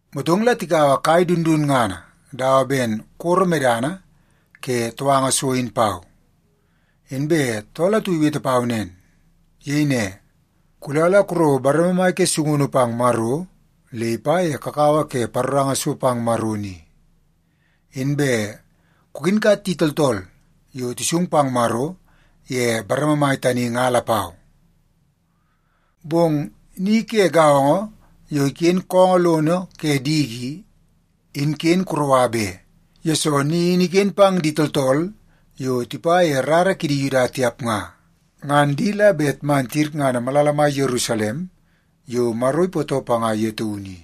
Motong la tikaua kai dundunngana dawa ben koro medana ke touanga so in pau, inbe tool atu iwete pau nen. Iyei ne, “Kula la kurouo bareme mai ke sungunu pang Maro le ipa ye kakawa ke paroranga so pang Maro ni, inbe kukinkat di tooltool yo tisung pang Maro ye bareme mai tani nga lapau. Bong ni ke gaongo yo iken koongoo lono ke diki i, in ken kuroua be, yesoo ni in iken pang di tooltool yo tipa ye rara ke di Yuda tiap nga. Ngan di la bet man tiyirngana malala mai Yerusalem yo Maro ipootoo panga ye taunu i,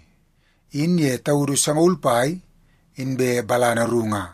in ye taudu sangaul pai inbe balana ru nga.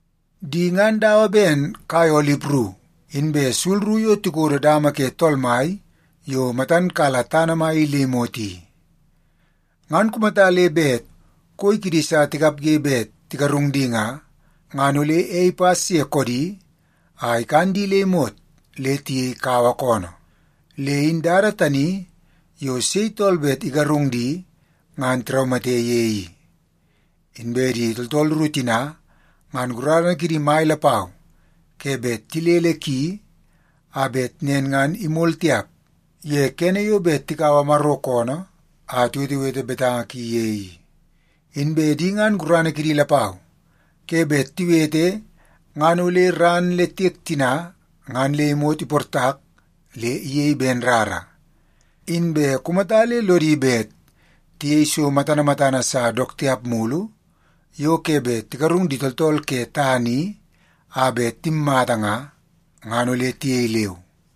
Di ngan dawa ben kai olip ru inbe sul ru yo tikodo dama ke Tool Mai yo matan kala tana mai i le imot i. Ngan kumata le bet koi kidi sa tikapge bet tigarung di nga, ngan ole ei ipas ye koodi a ikan di le imot le tiyei kawa koonoo. Le in dada tani yo sei tooltool bet igarung di ngan tiraumate ye i. Inbe di tooltool ru tina, ngan gurana kidi mai lapau ke bet tilele ki, a bet nen ngan imol tiap ye kene yo bet tikaua Maro koonoo a tiwetewete betanga ki ye i. Inbe di ngan gurana kidi lapau ke bet tiwete ngan ole ran le tiek tina ngan le imot iportak le iyei ben rara. Inbe kumata le lodi bet tiyei so matana matana sa dook tiap mulu yo ke bet igarung di tooltool ke tana i a bet timmata nga, ngan ole tiyei leu.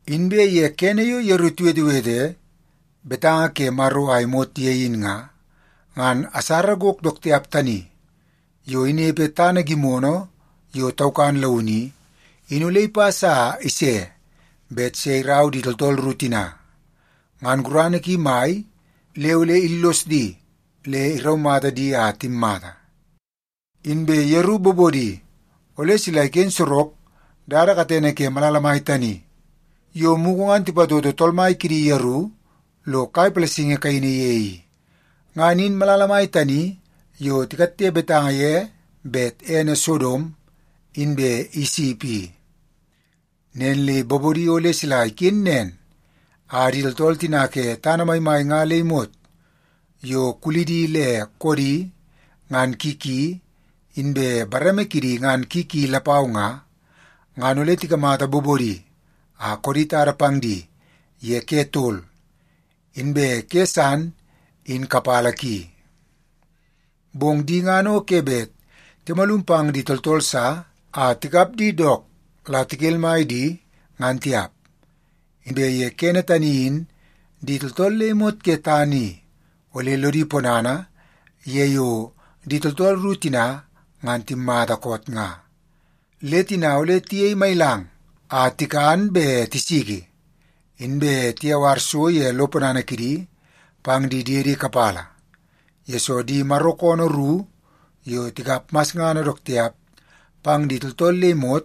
Inbe ye kene yo yeru tiwetewete betanga ke Maro a imot ye in nga, ngan asara gok dook tiap tani yo inepe tana gimono yo taukan launu i, in ole ipas a ise bet se irau di tooltool ru tina. Ngan gurana ki mai le ole illos di le iraumata di a timmata. Inbe yeru bobodi ole sila iken sorok dada katene ke malala mai tani yo mugu ngan tipatoto Tool Mai kidi yeru lo kai palasingi kaini ye i. Ngan in malala mai tani yo tikatte betanga ye bet ene Sodom inbe Isip i. Nen le bobodi ole sila iken nen a di tooltool tina ke tana maimai nga le imot yo kulidi le koodi ngan ki ki inbe bareme kidi ngan ki ki lapau nga, ngan ole tikamata bobodi a koodi tada pang di ye ke tol inbe ke san in kapala ki. Bong di ngan o ke bet timalum pang di tooltool sa a tikap di dook la tikelmai di, ngan tiap. Inbe ye kene tani in di tooltool le imot ke tana i ole lodi ponana ye yo di tooltool ru tina ngan timmata koot nga. Le tina ole tiyei mailang a tikan be tisiki, inbe tiyawar so ye lo ponana kidi pang di diedi kapala, yesoo di Maro koonoo ru yo tikap masngana dook tiap pang di tooltool le imot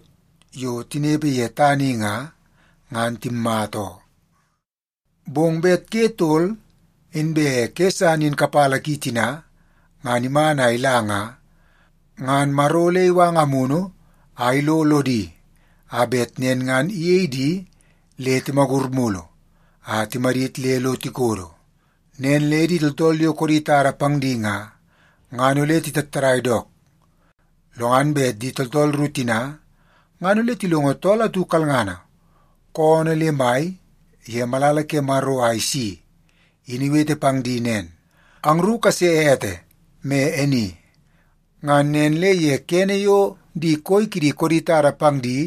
yo tinepe ye tana i nga, ngan timmata oo. Bong bet ke tol inbe ke san in kapala ki tina ngan iman a ila nga, ngan Maro ole iwanga Amunu a ilo lodi a bet nen ngan iyei di le timagur mulu a timadit le lo tikodo. Nen le di tooltool yo koodi tada pang di nga, ngan ole titattadai dook. Lo ngan bet di tooltool ru tina ngan ole tilongo tool atu kalngana koonoo le mai ye malala ke Maro a isi in iwete pang di nen, “Angru kase ete me e ni.” Ngan nen le ye kene yo di koi kidi koodi tada pang di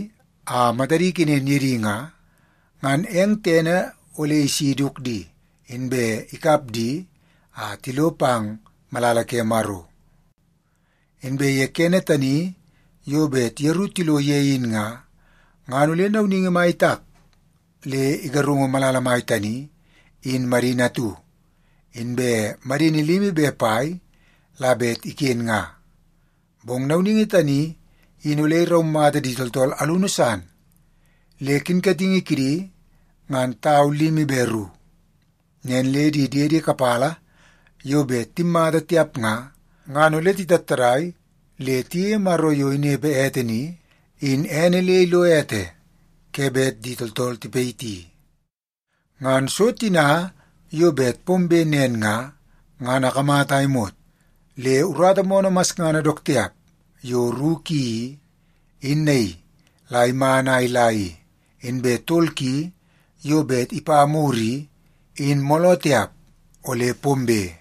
a matadi ikenen ye di nga, ngan eng tene ole isi iduk di, inbe ikap di a tilo pang malala ke Maro. Inbe ye kene tani yo bet yeru tilo ye in nga, ngan ole nauningi mai itak le igarungu malala mai tani in madini atu, inbe madini limi be pai la bet iken nga. Bong nauningi tani in ole iraumata di tooltool alunu san le kinkatingi kidi ngan tau limi be ru. Nen le di diedi kapala yo bet timmata tiap nga, ngan ole titattadai le tiyeie Maro yo inepe ete ni, in ene le ilo ete ke bet di tooltool tipayiti. Ngan so tina yo bet pombe nen nga, ngan akamata a imot le urata moonoo masngana dook tiap yo ru ki i, in naii la iman a ila i, inbe tol ki yo bet ipa mur i, in mooloo tiap ole pombe.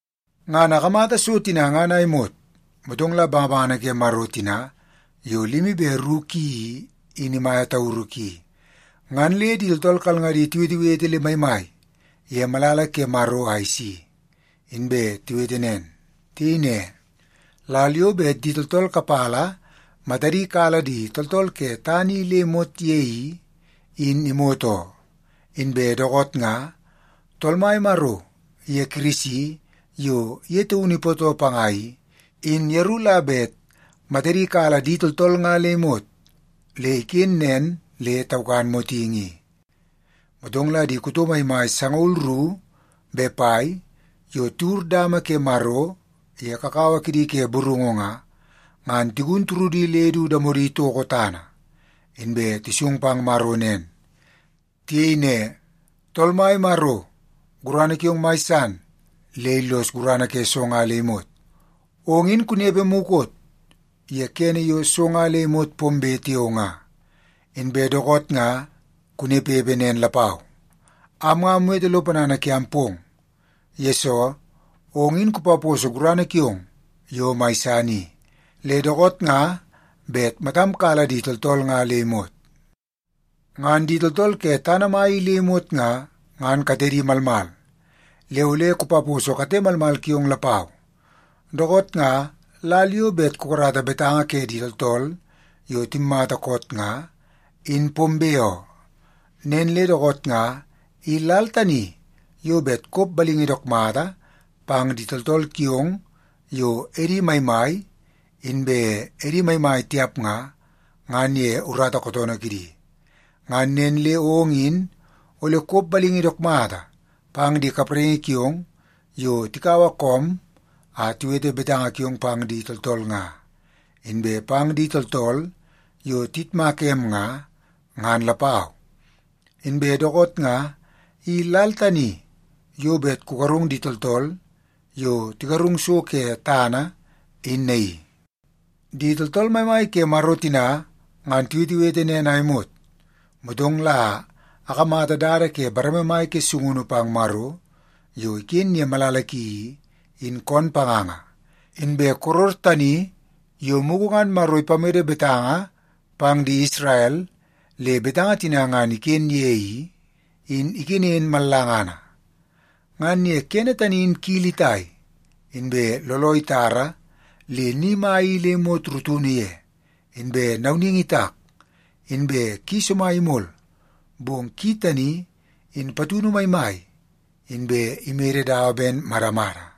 Ngan akamata so tina ngan a imot, motong la bangabangana ke Maro tina yo limi be ru ki i, in imaia tauru ki, ngan le di tooltool kalngadi tiwetewete le maimai ye malala ke Maro a isi, inbe tiwete nen. Tiyei ne, “Lal yo bet di tooltool kapala matadi kala di tooltool ke tana i le imot ye i, in imot oo. Inbe dookoot nga Tool Mai Maro iye Kirisi yo ye taunu ipootoo panga i, in yeru la bet matadi kala di tooltool nga le imot le iken nen le taukan motingi i.” Motong la di kuto maimai sangaul ru be pai yo tiwur dama ke Maro ye kakawa kidi ke burungu nga, ngan tigun turudi le du damodi itoko tana, inbe tisung pang Maro nen. Tiyei ne, “Tool Mai Maro, gurana kiong mai san le illos gurana ke so nga le imot. Ong in kunepe mukot ye kene yo so nga le imot pombe tiao nga, inbe dookoot nga kunepepe nen lapau. Am nga amwete lo ponana kiam pong, yesoo ong in kupaposo gurana kiong yo mai san i, le dookoot nga bet matam kala di tooltool nga le imot. Ngan di tooltool ke tana mai i le imot nga, ngan katedi malmal, le ole kupaposo kate malmal kiong lapau. Dookoot nga lal yo bet kukarata betanga ke di tooltool yo timmata koot nga, in pombe oo. Nen le dookoot nga i lal tani yo bet kop balingi dook mata pang di tooltool kiong yo edi maimai inbe edi maimai tiap nga, ngan ye urata kootoonoo kidi. Ngan nen le ong in ole kop balingi dook mata pang di kapraingi kiong yo tikaua koom a tiwete betanga kiong pang di tooltool nga, inbe pang di tooltool yo tiyitmaka em nga, ngan lapau. Inbe dookoot nga i lal tani yo bet kugarung di tooltool yo tigarung so ke tana in naii.” Di tooltool maimai ke Maro tina ngan tiwetewete nen a imot, motong la akamata dada ke bareme mai ke sungunu pang Maro yo iken ye malala ki i, in koon panganga. Inbe koror tani yo mugu ngan Maro ipamede betanga pang di Isrel le betanga tina ngan iken ye i, in ikenen mallangana. Ngan ye kene tani in kili itai, inbe looloo itara le ni mai i le imot rutunu ye, inbe nauningi itak, inbe ki somai imol, bong ki tani in patunu maimai inbe imede dawa ben madamada.